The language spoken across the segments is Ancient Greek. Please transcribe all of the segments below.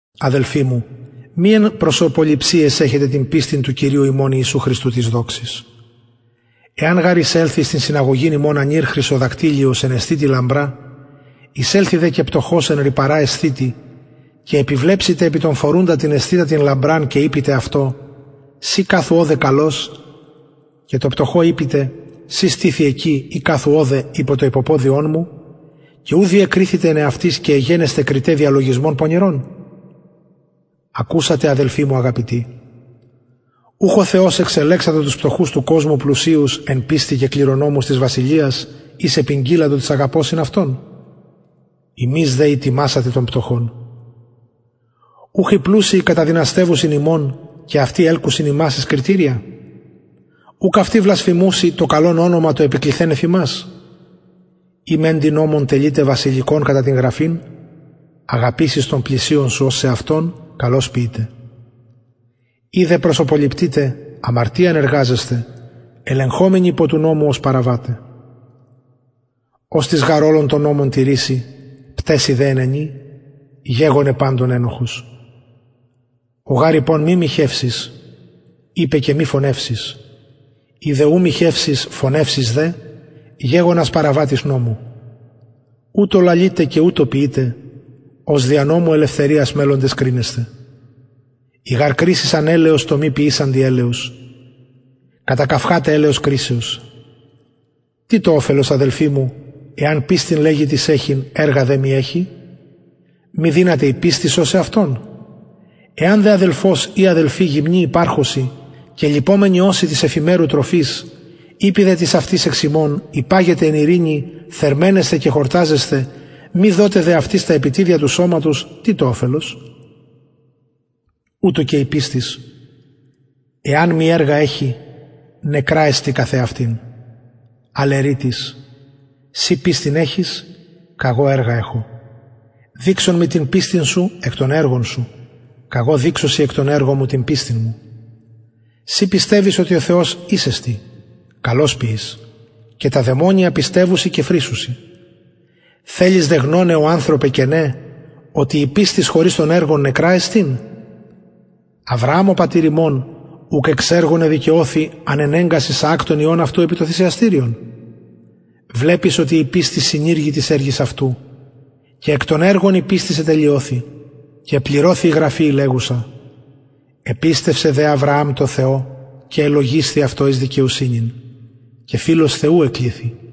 αδελφοι μου μη εν προσωποληψιαις εχετε την πιστιν του κυριου ημων ιησου χριστου της δοξης εαν γαρ εισελθη εις την συναγωγην υμων ανηρ χρυσοδακτυλιος εν εσθητι λαμπρα εισελθη δε και πτωχος εν ρυπαρα εσθητι και επιβλεψητε επι τον φορουντα την εσθητα την λαμπραν και ειπητε αυτω συ καθου ωδε καλως και τω πτωχω ειπητε συ στηθι εκει η καθου ωδε υπο το υποποδιον μου και ου διεκριθητε εν εαυτοις και εγενεσθε κριται διαλογισμων πονηρων ακουσατε αδελφοι μου αγαπητοι ουχ ο θεος εξελεξατο τους πτωχους του κοσμου πλουσιους εν πιστει και κληρονομους της βασιλειας ης επηγγειλατο τοις αγαπωσιν αυτον υμεις δε ητιμασατε τον πτωχον ουχ οι πλουσιοι καταδυναστευουσιν υμων και αυτοι ελκουσιν υμας εις κριτηρια ουκ αυτοι βλασφημουσιν το καλον ονομα το επικληθεν εφ υμας ει μεντοι νομον τελειτε βασιλικον κατα την γραφην αγαπησεις τον πλησιον σου ως σεαυτον καλως ποιειτε ει δε προσωποληπτειτε αμαρτιαν εργαζεσθε ελεγχομενοι υπο του νομου ως παραβαται οστις γαρ ολον τον νομον τηρησει πταισει δε εν ενι γεγονεν παντων ενοχος ο γαρ ειπων μη μοιχευσεις ειπεν και μη φονευσεις ει δε ου μοιχευσεις φονευσεις δε γεγονας παραβατης νομου ουτως λαλειτε και ουτως ποιειτε ως δια νομου ελευθεριας μελλοντες κρινεσθαι η γαρ κρισις ανελεος τω μη ποιησαντι ελεος κατακαυχαται ελεον κρισεως τι το οφελος αδελφοι μου εαν πιστιν λεγη τις εχειν εργα δε μη εχη μη δυναται η πιστις σωσαι αυτον εαν δε αδελφος η αδελφη γυμνοι υπαρχωσιν και λειπομενοι ωσιν της εφημερου τροφης ειπη δε τις αυτοις εξ υμων υπαγετε εν ειρηνη θερμαινεσθε και χορταζεσθε μη δωτε δε αυτοις τα επιτηδεια του σωματος τι το οφελος ουτως και η πιστις εαν μη εργα εχη νεκρα εστιν καθ εαυτην αλλ ερει τις συ πιστιν εχεις καγω εργα εχω δειξον μοι την πιστιν σου εκ των εργων σου καγω δειξω σοι εκ των εργων μου την πιστιν μου συ πιστευεις οτι ο θεος εις εστιν καλως ποιεις και τα δαιμονια πιστευουσιν και φρισσουσιν θελεις δε γνωναι ω ανθρωπε κενε οτι η πιστις χωρις των εργων νεκρα εστιν αβρααμ ο πατηρ ημων ουκ εξ εργων εδικαιωθη ανενεγκας ισαακ τον υιον αυτου επι το θυσιαστηριον βλεπεις οτι η πιστις συνηργει τοις εργοις αυτου και εκ των εργων η πιστις ετελειωθη και επληρωθη η γραφη η λεγουσα επιστευσεν δε αβρααμ τω θεω και ελογισθη αυτω εις δικαιοσυνην και φιλος θεου εκληθη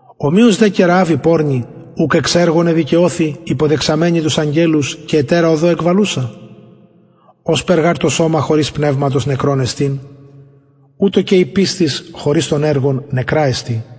ομοιως δε και ρααβ η πορνη ουκ εξ εργων εδικαιωθη υποδεξαμενη τους αγγελους και ετερα οδω εκβαλουσα ωσπερ γαρ το σωμα χωρις πνευματος νεκρον εστιν ουτως και η πιστις χωρις των εργων νεκρα εστιν